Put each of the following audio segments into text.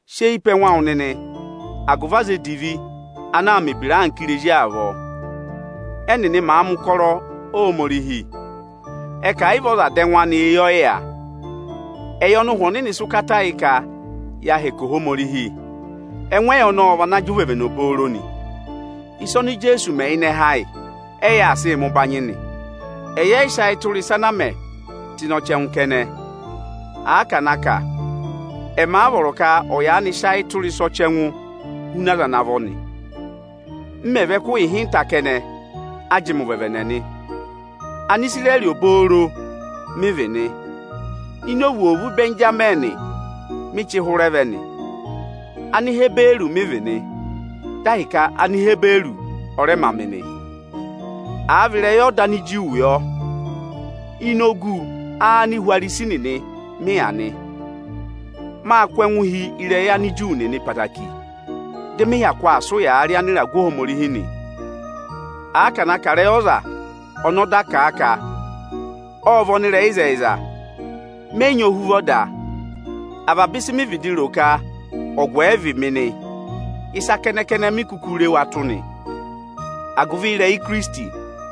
Sị eyi pe ẹngụ awụ nịnị agụvị aza edivi ana aa mẹ̀ ebira anka irezi avọọ. Ẹ́nịnị maà mẹ̀ ụkọrọ Ohomorihi, ẹ ka ẹ̀ yị vị ọza dà ẹngụ anị, eyi ọ yị yà. Ẹyị ọnị Ụhwẹ Ọnịnị sị ụkata yị ka yaa hẹkẹ Ohomorihi, ẹngụ ẹyị ọnọọ ọ vana jị ụvẹvẹnẹ obooro nị. Ịsa oni Ijeesu mẹ ịnị ẹhẹ ayị, ẹyị aa sịị mẹ ụbanyị nị. Ẹyị ẹ yị sị ayị tụra ịsa ana a mẹ tụ́ ịnị ọchẹngụ kẹnẹ. Àa ka na kà, ẹmị a vọrọ ka ọ̀ yaanị sị ayị tụra ịsa ọchẹngụ huna aza vọ nị. M mẹ̀ vị ẹkụhị ịhịnta kẹnẹ, a jị mị ụvẹvẹnẹ nị. Anisirẹrị obooro mị vị nị. Ini ovwoovu Ịbẹnjamịnị mị chị hụrẹ vẹ nị. Anihiburu mị vị nị, dị ahịka Anihiburu ọ rẹ ma mị nị. Àa va vị ịrẹyị ọda Aniju nịnị ị yọ, ini ogu Anihwarisi nịnị mị yà nị. Máa kụ́ ẹngụ hi ịrẹyị Anịju nịnị ẹtẹẹtẹrẹ, dị mị hyakụ aa sị ụyaa rị Anịragụ Ohomorihi nị. Àa ka na kà ịrẹyị ọza ọnị ọda kà a ka ọ́ọ vị ọnịrẹyịzẹyịza, mẹ yị nyị ohuvọ da. Avaba ịsị mị vịdị ro ka ọgụ ẹ vị mị nị, ịsa kẹnẹ-kẹnẹ mi kuku re wa tụ́ nị, agụvị ịrẹyị Ikirisiti.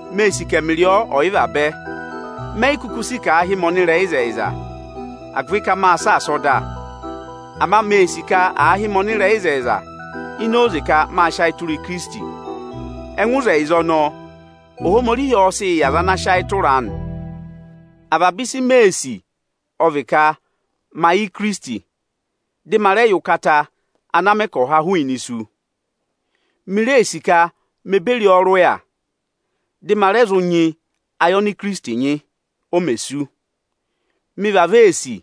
Mee sì ka ẹmịrị ọ ọ̀ yị vabẹ. Mé yi kuku si ka aa hị́ mị ọnịrẹyịzẹyịza ini oze ka maa sị ayị tụra ọda. Ama mee sì ka àa hị́ mị ọnịrẹyịzẹyịza ini oze ka maa sị ayị tụra Ikirisiti. Ẹngụ ịzẹyịza ọnọọ, Ohomorihi ọọ̄ sị yị ọza ana sị ayị tụra a nị. Avaba ịsị mee sì ọ vị ka ma yẹ Ikirisiti, dị ma rẹ yẹ ụkata ana mẹ ka ọ̀ há hụụnị isu. Mi ree sì ka me beri ọ rị ụya, dị ma rẹ zụ nyị ẹngụ ayị ọnị Ikirisiti nyị o me sú. Mị vavọọ ee sì,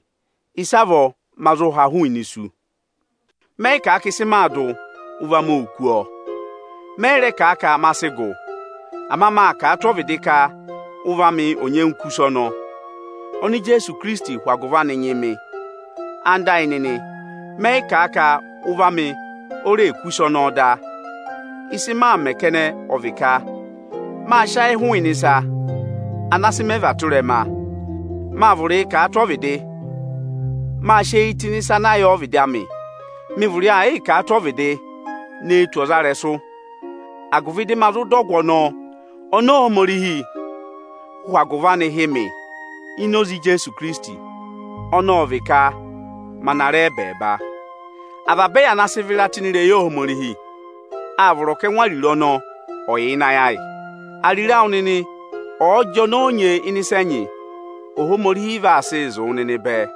ịsavọọ ma zụ ha hụụnị isu. Mẹ yị kà a ka ịsị maa dụ, ụvọ amị óo kú ọ; mẹ yị rẹ kà a ka ma sị gụ. Ama maa kà a tụ́ ọvịdị ka ụvọ amị ọ̀ nyẹngụ kú ịsa ọnọọ, oni Ijeesu hụ agụvị anị nyị mị. Ẹwụ nịnị ẹyịnyara amị, mẹ yị kà a ka ụvọ amị o reè kú ịsa ọnọọ da. Ịsị maa mẹ̀ kẹnẹ ọ vị ka maa sị ayịị hụụnị ịsa ana sị mẹ và tụ ịrẹma; maa vụrịị kà a tụ ọvịdị, máa sị eyi tụ́ ịnị ịsa ana yà ọvịdị amị Mị vụrị aa yịị kà a tụ́ ọvịdị ne tù ọzarẹyịrẹsụ, agụvị dị ma zụ dọ ọgụ ọnọọ, oni Ohomorihi hụ agụvị anị hị́ mị ini Ikirisiti; ọnị ọ vị ka ma na ra ẹbẹẹba nị. Avaba ẹyị ana sị vịra tụ́ ịnị ịrẹyị Ohomorihi, áa vọrọ ka ẹngụ ariro ọnọọ ọ̀ yà ịnị ayị ayị. Ariro awụ nịnị ọ̀ọ jị ọnọọ nyee ịnị ịsa ẹnyị, Ohomorihi vaa sịị zụ̀ wụ nịnị bẹẹ.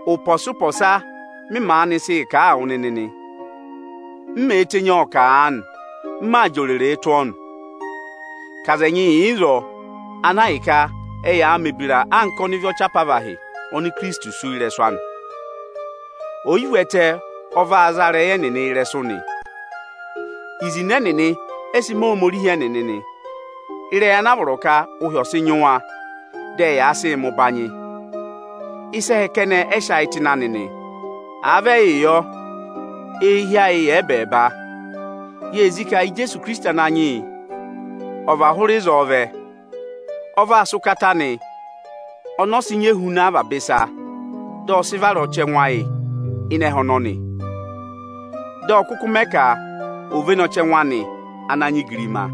Ụpọọpọsa m maanị sịị kà a wụ nịnị nị; m mèe tenyi ọọ kà aanị, m maa jị oreree tụ́ ọ nị, ka aza ẹnyị yà ịzọọ, ana ahịka ẹyaa mẹ̀ ebira anka ọnịvị ọchị apavahị oni Ikirisiti sú ị́rẹsụ anị nị. Oyivu ẹtẹ ọ vaa za ịrẹyị ẹnịnị ịrẹsụ nị. Izinẹ ẹnịnị ẹ́ sị mẹ Ohomorihi ẹnịnị nị; ịrẹyị ana a vọrọ ka ụhị ọ̀ sịị nyị wa, dị ẹyaa sịị mẹ ụbanyị. Ịsa ẹhẹ kẹnẹ ẹ sị ayị tụ́ ịnị anị nị. Àa vị ẹyị yọ, eehi ayị yà ẹbẹẹba. Yee zí ka Ijeesu Ikirisiti Ananyị yị ọ̀ và hụụ ịzọọ vẹ. Ọ vaa sị ụkata anị ọnị ọ sị nyị ehuna avaba ịsa, dị ọ sị vara ọchẹngụ ayị ịnị ẹhẹ ọnọnị, dị ọ kụkụ mẹẹ ka ò véné ọchẹngụ anị ana nyị igirima.